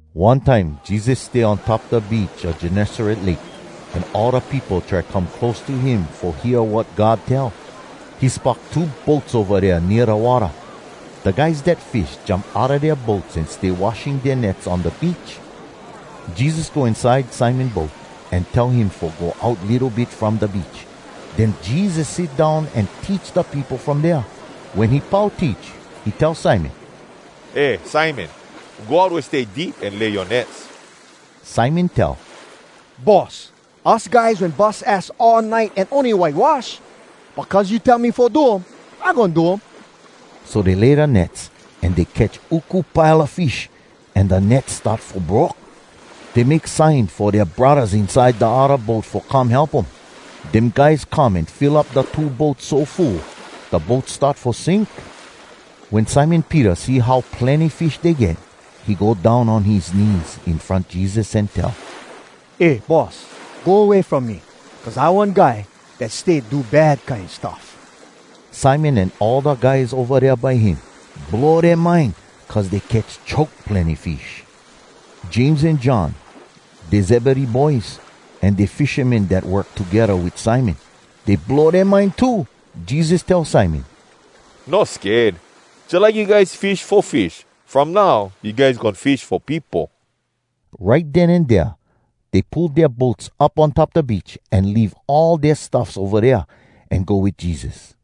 One time Jesus stay on top da beach a Gennesaret Lake, an all da peopo try come close by him fo hear wat God tell. He spock two boats ova dea nea da watta. Da guys dat fish jump outa dea boats an stay washing dea nets on da beach. Jesus go inside Simon boat, an tell him fo go out litto bit from da beach. Den Jesus sit down an teach da peopo from dea. Wen he pau teach, he tell Simon, “Eh Simon, go out wea stay deep an lay yoa nets.” Simon tell, “Boss, us guys wen bus ass all nite an ony whitewash. But cuz you tell me fo do um, I goin do um.” So dey lay da nets, an dey catch uku pile a fish, an da nets start fo broke. Dey make sign fo dea braddahs inside da odda boat fo come help um. Dem guys come an fill up da two boats so full, da boats start fo sink. Wen Simon Peter see how plenny fish dey get, he go down on his knees in front Jesus an tell, “Eh, Boss, go way from me, cuz I one guy dat stay do bad kine stuff!” Simon an all da guys ova dea by him, blow dea mind, cuz dey catch choke plenny fish. James an John, dey Zebedee boys, an dey fishamen dat work togedda wit Simon. Dey blow dea mind too. Jesus tell Simon, “No sked. Jalike you guys fish fo fish, from now you guys goin fish fo peopo!” Right den an dea, dey pull dea boats up on top da beach, an leave all dea stuffs ova dea, an go wit Jesus.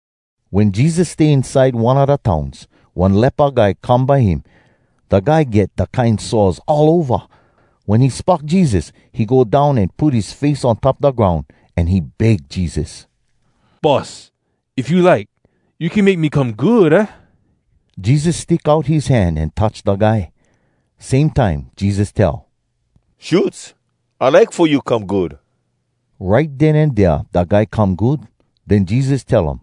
Wen Jesus stay inside one a da towns, one lepa guy come by him. Da guy get da kine sores all ova. Wen he spock Jesus, he go down an put his face on top da groun, an he beg Jesus, “Boss, if you like, you can make me come good, aah?” Jesus stick out his hand an touch da guy. Same time Jesus tell, “Shoots, I like fo you come good!” Right den an dea da guy come good. Den Jesus tell um,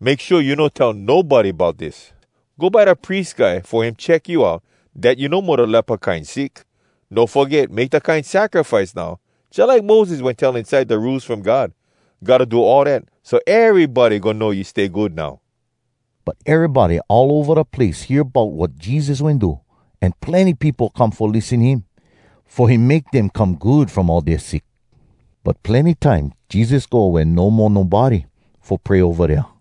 “Make shua you no tell nobody bout dis! Go by da pries guy fo him check you out dat you no mo da lepa kine sick. No foget make da kine sacrifice now, jalike Moses wen tell inside da Rules From God. Gotta do all dat, so erybody goin know you stay good now.” But erybody all ova da place hear bout wat Jesus wen do, an plenny peopo come fo lissen him, fo him make dem come good from all dea sick. But plenny time Jesus go wea no mo nobody, fo pray ova dea.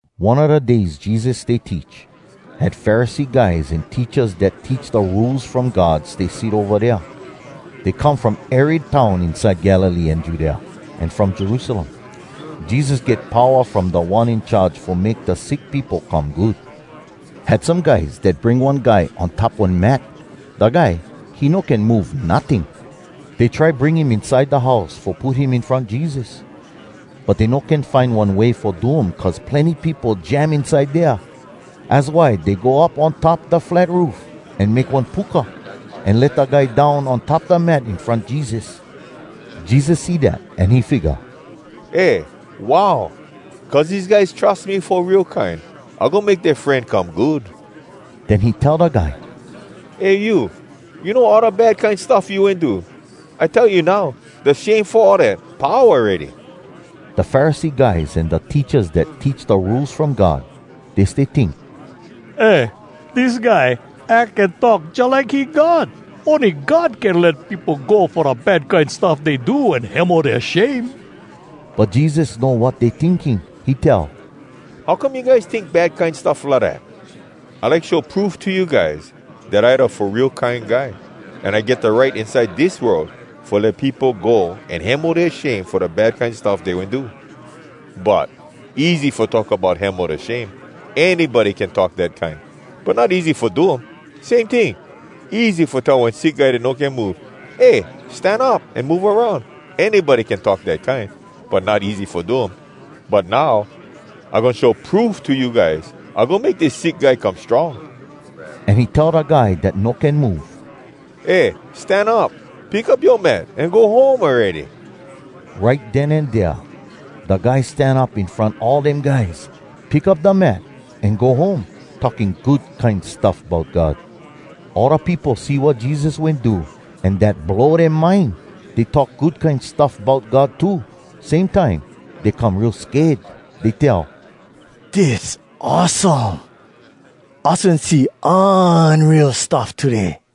One a da days Jesus stay teach, had Pharisee guys an teachas dat teach da Rules From God stay sit ova dea. Dey come from ery town inside Galilee an Judea, an from Jerusalem. Jesus get powa from Da One In Charge fo make da sick peopo come good. Had some guys dat bring one guy on top one mat. Da guy, he no can move, notting. Dey try bring him inside da house fo put him in front Jesus. But dey no can find one way fo do um cuz plenny peopo jam inside dea. Az why dey go up on top da flat roof, an make one puka, an let da guy down on top da mat in front Jesus. Jesus see dat, an he figga, “Eh, wow! Cuz dese guys trus me fo real kine, I goin make dea fren come good!” Den he tell da guy, “Eh you, you know all da bad kine stuff you wen do? I tell you now, da shame fo all dat, pau awready!” Da Pharisee guys an da teachas dat teach da Rules From God, dey stay tink, “Eh, dis guy ack an talk jalike he God! Ony God can let peopo go fo da bad kine stuff dey do an hemo dea shame!” But Jesus know wat dey tinking. He tell, “How come you guys tink bad kine stuff lidat? I like show proof to you guys, dat I da Fo Real Kine Guy, an I get da right inside dis world fo let peopo go an hemo dea shame fo da bad kine stuff dey wen do. But, easy fo talk bout hemo da shame—anybody can talk dat kine. But not easy fo do um. Same ting, easy fo tell one sick guy dat no can move, ‘Eh, stan up an move aroun!’—anybody can talk dat kine. But not easy fo do um. But now, I goin show proof to you guys—I goin make dis sick guy come strong.” An he tell da guy dat no can move, “Eh, stan up! Pick up yoa mat, an go home awready!” Right den an dea da guy stan up in front all dem guys, pick up da mat, an go home, talking good kine stuff bout God. All da peopo see wat Jesus wen do an dat blow dea mind. Dey talk good kine stuff bout God too. Same time, dey come real sked. Dey tell, “Dis awesome! Us wen see unreal stuff today!”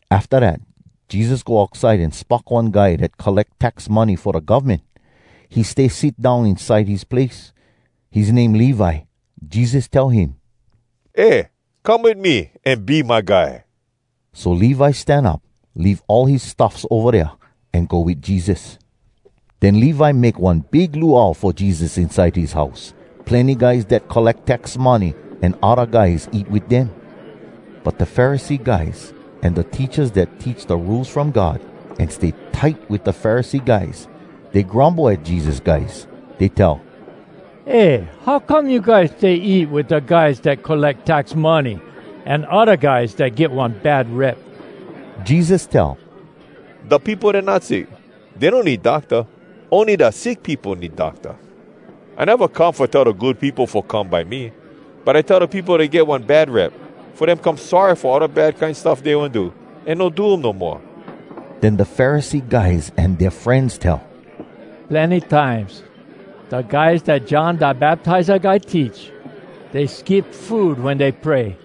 Afta dat Jesus go outside an spock one guy dat colleck tax money fo da govmen. He stay sit down inside his place. His name Levi. Jesus tell him, “Eh, come wit me, an be my guy!” So Levi stan up, leave all his stuffs ova dea, an go wit Jesus. Den Levi make one big luau fo Jesus inside his house. Plenny guys dat colleck tax money an odda guys eat wit dem. But da Pharisee guys an da teachas dat teach da Rules From God an stay tight wit da Pharisee guys, dey grumble at Jesus guys. Dey tell, “Eh, how come you guys stay eat wit da guys dat colleck tax money an odda guys dat get one bad rep?” Jesus tell, “Da peopo dat not sick, dey no need docta. Ony da sick peopo need docta. I neva come fo tell da good peopo fo come by me, but I tell da peopo dat get one bad rep, fo dem come sorry fo all da bad kine stuff dey wen do, an no do um no moa.” Den da Pharisee guys an dea frenz tell, “Plenny times, da guys dat John Da Baptiza guy teach, dey skip food wen dey pray.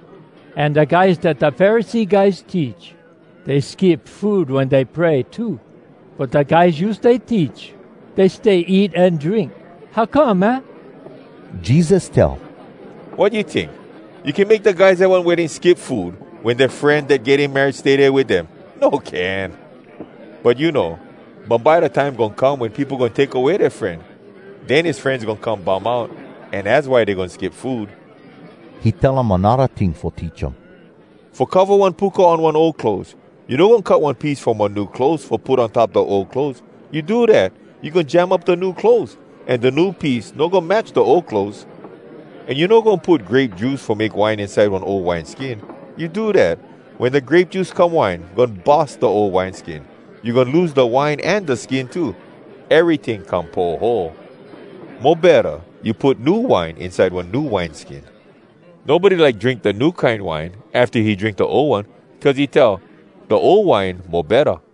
An da guys dat da Pharisee guys teach, dey skip food wen dey pray too. But da guys you stay teach, dey stay eat an drink. How come, aah?” Jesus tell, “Wat you tink? You can make da guys at one wedding skip food wen dea fren dat getting married stay dea wit dem? No can! But you know, bumbye da time goin come wen peopo goin take away dea fren. Den his frenz goin come bum out, an az why dey goin skip food!” He tell um anodda ting fo teach um. “Fo cova one puka on one ol clothes, you no goin cut one piece from one new clothes, fo put on top da ol clothes. You do dat, you goin jam up da new clothes, an da new piece no goin match da ol clothes. An you no goin put grape juice fo make wine inside one ol wineskin. You do dat, wen da grape juice come wine, goin bus da ol wineskin. You goin lose da wine an da skin too. Eryting come poho! Mo betta, you put new wine inside one new wineskin. Nobody like drink da new kine wine afta he drink da ol one, cuz he tell, ‘Da ol wine mo betta.’”